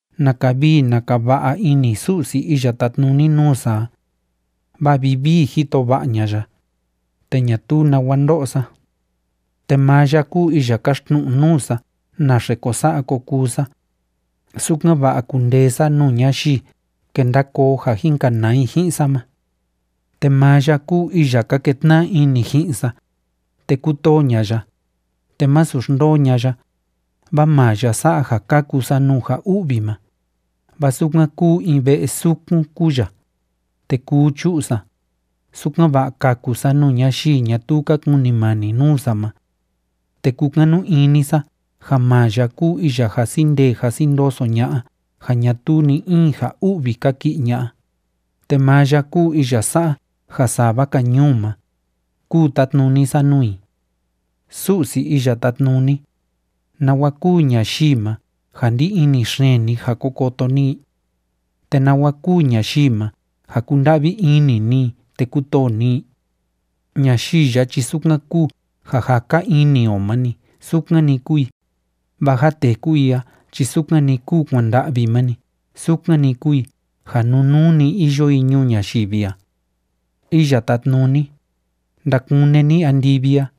¡Naka vii naka va'a ini Su'si iya tátnuni nuu sa a! Vaa vivii jito va'a ña'a ya, te ñatuu nawa ndo'o sa. Te maa ya kúu iya kaxtnu'u nuu sa naxe ko sa'a ko kuu sa, sukan‑va'a kundee sa nuu ñayii kenda koo ja jin kanaa i ji'in sa ma. Te maa ya kúu iya ka ketna'a ini ji'in sa, te kútoo ña'a ya, te másu xndoo ña'a ya, vaa maa ya sa'a ja kaku sa nuu ja u'vi ma, vaa sukan kúu in ve'e sukun kúu ya, te kuu chu'u sa, sukan‑va'a kaku sa nuu ñayii ñatuu ka kunimani nuu sa ma. Te kúkanu ini sa ja maa ya kúu iya jasi ndee jasi ndoso ña'a ja ñatuu ni‑in ja u'vi kaki'i ña'a, te maa ya kúu iya sa'a ja sava‑ka ñuu ma, kúu tátnuni sa nuu i. Su'si Iya Tátnuni, ¿nawa kúu ñayii ma ja ndí ini xeen ni ja ko koto ni i? ¿Te nawa kúu ñayii ma ja kúnda'vi ini ni i te kútoo ni i? Ñayii ya chi sukan kúu ja jaka ini o ma‑ni sukan‑ni kúu i, vaa ja téku i a chi sukan‑ni kúu kuanda'vi ma‑ni sukan‑ni kúu i ja nunuu‑ni iyo i ñuu ñayivi a. Iya Tátnuni, ndakune ni andivi a,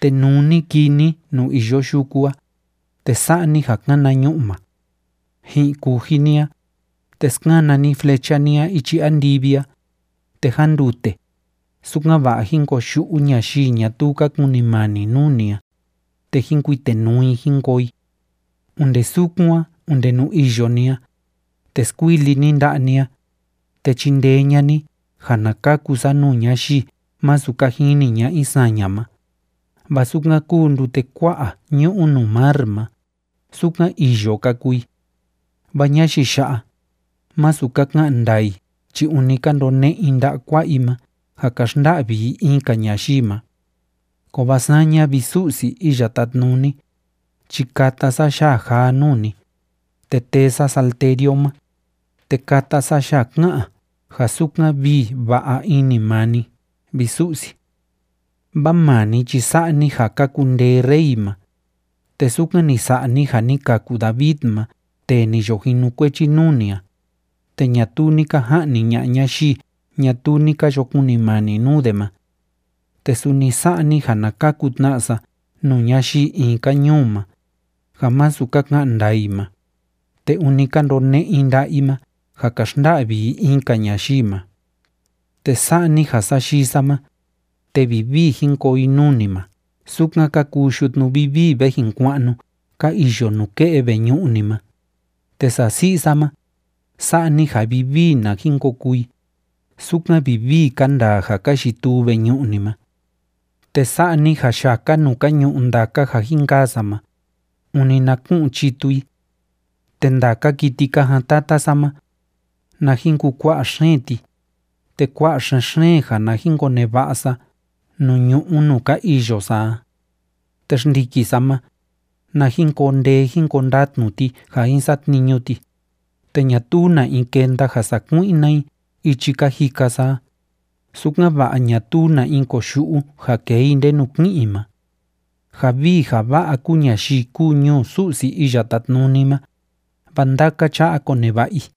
te nuu ni kii ni nuu iyo yuku a, te sa'a ni ja kana ñu'ma. Ji'in kuji ni a, te skana ni flecha ni a ichi andivi a, te jándute, sukan‑va'a jín koyu'u ñayii ñatuu ka kunimani nuu ni a, te jín kuitenuu i jín koo i. Onde sukun a onde nuu iyo ni a, te skuili ni nda'a ni a, te chindee ña'a ni ja na kaku sa nuu ñayii masu ka jini ña'a i saña ma, vaa sukan kúu ndute kua'a ñu'u nuu mar ma, sukan îyo ka kuu i, vaa ñayii ya'a, másu ka ka'an ndaa i chi ûni ka ndone'e i nda'a kua'a i ma ja ka xnda'vi i in‑ka ñayii ma. Kovaa saña, vi Su'si Iya Tátnuni, chi kata sa yaa jaa nuu ni, te tee sa salterio ma, te kata sa yaa ká'an ja sukan vii va'a ini maa ni, vi Su'si. Vaa maa ni chi sa'a ni ja ka kundee rey ma, te sukan ni sa'a ni ja ni kaku David ma tee ni yo jinukuechi nuu ni a, te ñatuu ni ka ja'ni ña'a ñayii ñatuu ni ka yo kunimani nuu de ma. Te suni sa'a ni ja na kaku tna sa nuu ñayii in‑ka ñuu ma, ja masu ka ka'an ndaa i ma, te ûni ka ndone'e i nda'a i ma ja ka xnda'vi i in‑ka ñayii ma. Te sa'a ni ja sayii sa ma, te vivii jin koo i nuu ni ma sukan ka kuu yutnu vivii ve jin kua'nu ka iyo nuke'e veñu'u ni ma, te sasi'i sa ma, sa'a ni ja vivii na jin ko kuu i, sukan vivii ka ndaa ja ka yituu veñu'u ni ma. Te sa'a ni ja yaka nuu ka ñu'u ndaka ja jin kaa sa ma, ûni na ku'un chitu i. Te ndaka kiti ka jaan tata sa ma, na jin kukua'a xeen ti, te kua'a xen‑xeen ja na jin koneva'a sa nuu ñu'ú nuu ka iyo sa a. Te xndiki sa ma, na jin koo ndee jin koo ndatnu ti ja jin satniñu ti, te ñatuu na in kenda ja sakui'na i ichi ka jika sa a, sukan‑va'a ñatuu na in koyu'u ja kee i ndenu ki'in i ma. Ja vii ja va'a kúu ñayii kúu ñuu Su'si Iya Tátnuni ma, vaa ndaka cha'a koneva'a i.